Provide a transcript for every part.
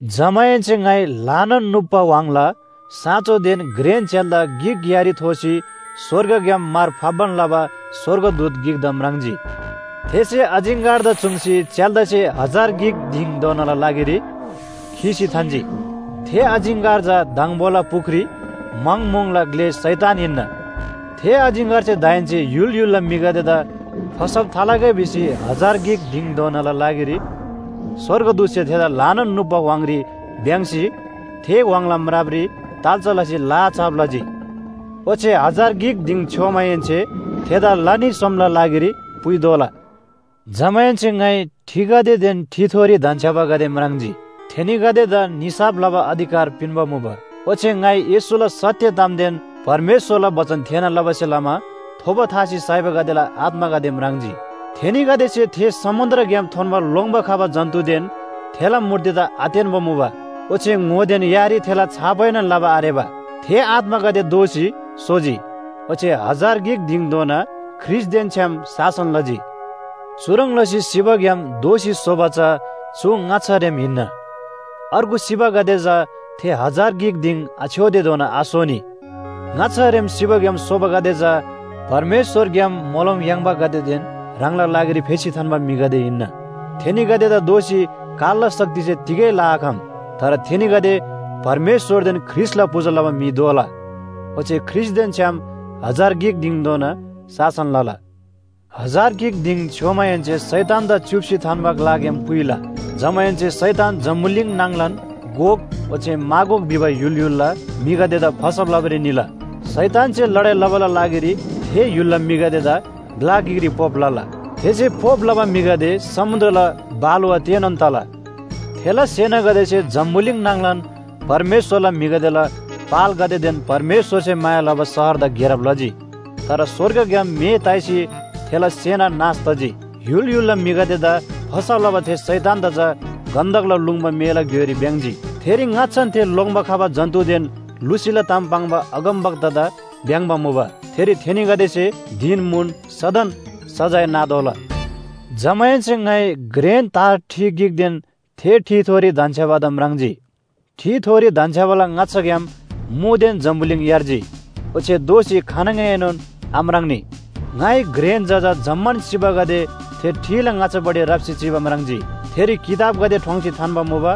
जमाहेन्‍से ङाइ ल्‍हानान नुप्‍बा व्‍हाङला साँचोदेन घ्रेन च्‍याल्‍दा गिक यारी थोसी स्‍वर्गग्‍याम मार फाप्‍बान लबा स्‍वर्गदूत गिकदा म्राङ्जी। थेसे अजिङ्‍गरदा चुङ्सी च्‍याल्‍दासे हजार गिक दिङधोनाला लागिरी खीसी थान्‍जी। थे अजिङ्‍गर चा दङबोला पुख्री म्‍हङ म्‍हुङला ग्‍ले शैतान हिन्‍ना। थे अजिङ्‍गरसे दाहेन्‍से य्‍हुल य्‍हुलला म्‍हिगदेदा फसब थालगै भिसी हजार गिक दिङधोनाला लागिरी स्‍वर्गदूतसे थेदा ल्‍हानान नुप्‍बा व्‍हाङरी भ्‍याङ्‍सी थे व्‍हाङला म्रापरी ताल्‍चा लसी लाहा छाप लजी। ओच्‍छे हजार गिक दिङ छ्‌योमाहेन्‍से थेदा ला न्‍ही सोमला लागिरी पुइतोःला। जमाहेन्‍से ङाइ ठिगदेदेन ठिथोरी धन्‍छ्‌याबागदे म्राङ्जी। थेनीगदेला निसाफ लबा अधिकार पिन्‍बा मुबा। ओच्‍छे ङाइ येशूला सत्‍य तामदेन परमेश्‍वरला बचन थेःना लबासे लमा थोबो थासी साइबागदेला आत्‍मागदे म्राङ्जी। थेनीगदेसे थे समुन्‍द्रग्‍याम थोन्‍बा लोङ्‌बा खबा जन्‍तुदेन थेला मूर्तिदा आतेन्‍बा मुबा ओच्‍छे ङोदेन यारी थेला छापएनोन लबा आरेबा। थे आत्‍मागदे दोःसी सोजी ओच्‍छे हजार गिक दिङधोना ख्रीष्‍टदेन छ्‌याम शासन लजी। चुह्रङ् लसी सिबाग्‍याम दोःसी सोबा चा चु ङाच्‍छा रेम हिन्‍ना। अर्गु सिबागदे चा थे हजार गिक दिङ आछ्‌योतेधोना आसोनी। ङाच्‍छारेम सिबाग्‍याम सोबागदे चा परमेश्‍वरग्‍याम मोलम याङ्‌बागदेदेन ह्राङला लागिरी फेसी थान्‍बा म्‍हिगदे हिन्‍ना। थेनीगदेदा दोःसी कालला शक्तिसे तिगै लआखम। तर थेनीगदे परमेश्‍वरदेन ख्रीष्‍टला पूजा लबा म्‍हि दोला ओच्‍छे ख्रीष्‍टदेन छ्‌याम हजार गिक दिङधोना शासन लला। हजार गिक दिङ छ्‌योमाहेन्‍से शैतानदा च्‍युप्‍सी थान्‍बा ग्‍लाग्‍याम पुइला। जमाहेन्‍से शैतान जम्‍बुलिङ नाङलान गोग ओच्‍छे मागोग भिबा य्‍हुल य्‍हुलला म्‍हिगदेदा फसब लबारी निला। शैतानसे लडाइ लबाला लागिरी थे य्‍हुलला म्‍हिगदेदा ग्‍ला गिकरी पोप लला। थेसे पोप लबा म्‍हिगदे समुन्‍द्रला बालुवा तेनोन तला। थेला सेनागदेसे जम्‍बुलिङ नाङलान परमेश्‍वरला म्‍हिगदेला पालगदेदेन परमेश्‍वरसे माया लबा शहरदा घेरब लजी। तर स्‍वर्गग्‍याम मे ताइसी थेला सेना नाश तजी। य्‍हुल य्‍हुलला म्‍हिगदेदा फसब लबा थे शैतानदा चा गन्‍धकला लुङ्बा मेला घ्‍योइरी भ्‍याङ्‍जी। थेरी ङाच्‍छान थे लोङ्‌बा खबा जन्‍तुदेन लुसीला ताम पाङ्बा अगमवक्तादा भ्‍याङ्‍बा मुबा। थेरी थेनीगदेसे धिन म्‍हुन सदन सजाय नातोःला। जमाहेन्‍से ङाइ घ्रेन तार ठि गिकदेन थे ठिथोरी धन्‍छ्‌याबादा म्राङ्जी। ठिथोरी धन्‍छ्‌याबाला ङाच्‍छाग्‍याम मुदेन जम्‍बुलिङ यार्जी ओच्‍छे दोःसी खानङएनोन आम्राङ्‌नी। ङाइ घ्रेन जजा जम्‍मान सिबागदे थे ठिला ङाच्‍छापट्टि राप्‍सी चिबा म्राङ्जी। थेरी किताबगदे ठोङ्सी थान्‍बा मुबा,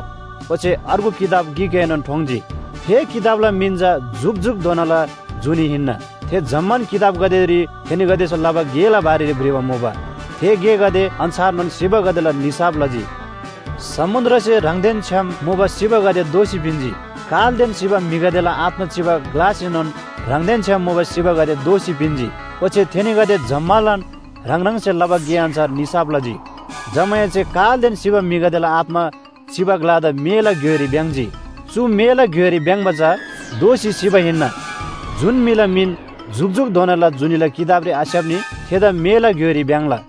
ओच्‍छे अर्गु किताब गिकएनोन ठोङ्‌जी। थे किताबला मिन चा जुकजुकधोनाला जुनी हिन्‍ना। थे जम्‍मान किताबगदेरी थेनीगदेसे लबा गेला बारेरी भ्रिबा मुबा, थे गेगदे अन्‍छारनोन सिबागदेला निसाफ लजी। समुन्‍द्रसे ह्राङदेन छ्‌याम मुबा सिबागदे दोःसी पिन्‍जी, कालदेन सिबा म्‍हिगदेला आत्‍मा चिबा ग्‍लासेनोन ह्राङदेन छ्‌याम मुबा सिबागदे दोःसी पिन्‍जी। ओच्‍छे थेनीगदे जम्‍मालान ह्राङ ह्राङसे लबा गे अन्‍छार निसाफ लजी। जमाहेन्‍से कालदेन सिबा म्‍हिगदेला आत्‍मा चिबा ग्‍लादा मेला घ्‍योइरी भ्‍याङ्‍जी। चु मेला घ्‍योइरी भ्‍याङ्‍बा चा दोःसी सिबा हिन्‍ना। जुन म्‍हिला मिन जुकजुकधोनाला जुनीला किताबरी आस्‍याप्‍नी थेदा मेला घ्‍योइरी भ्‍याङ्‍ला।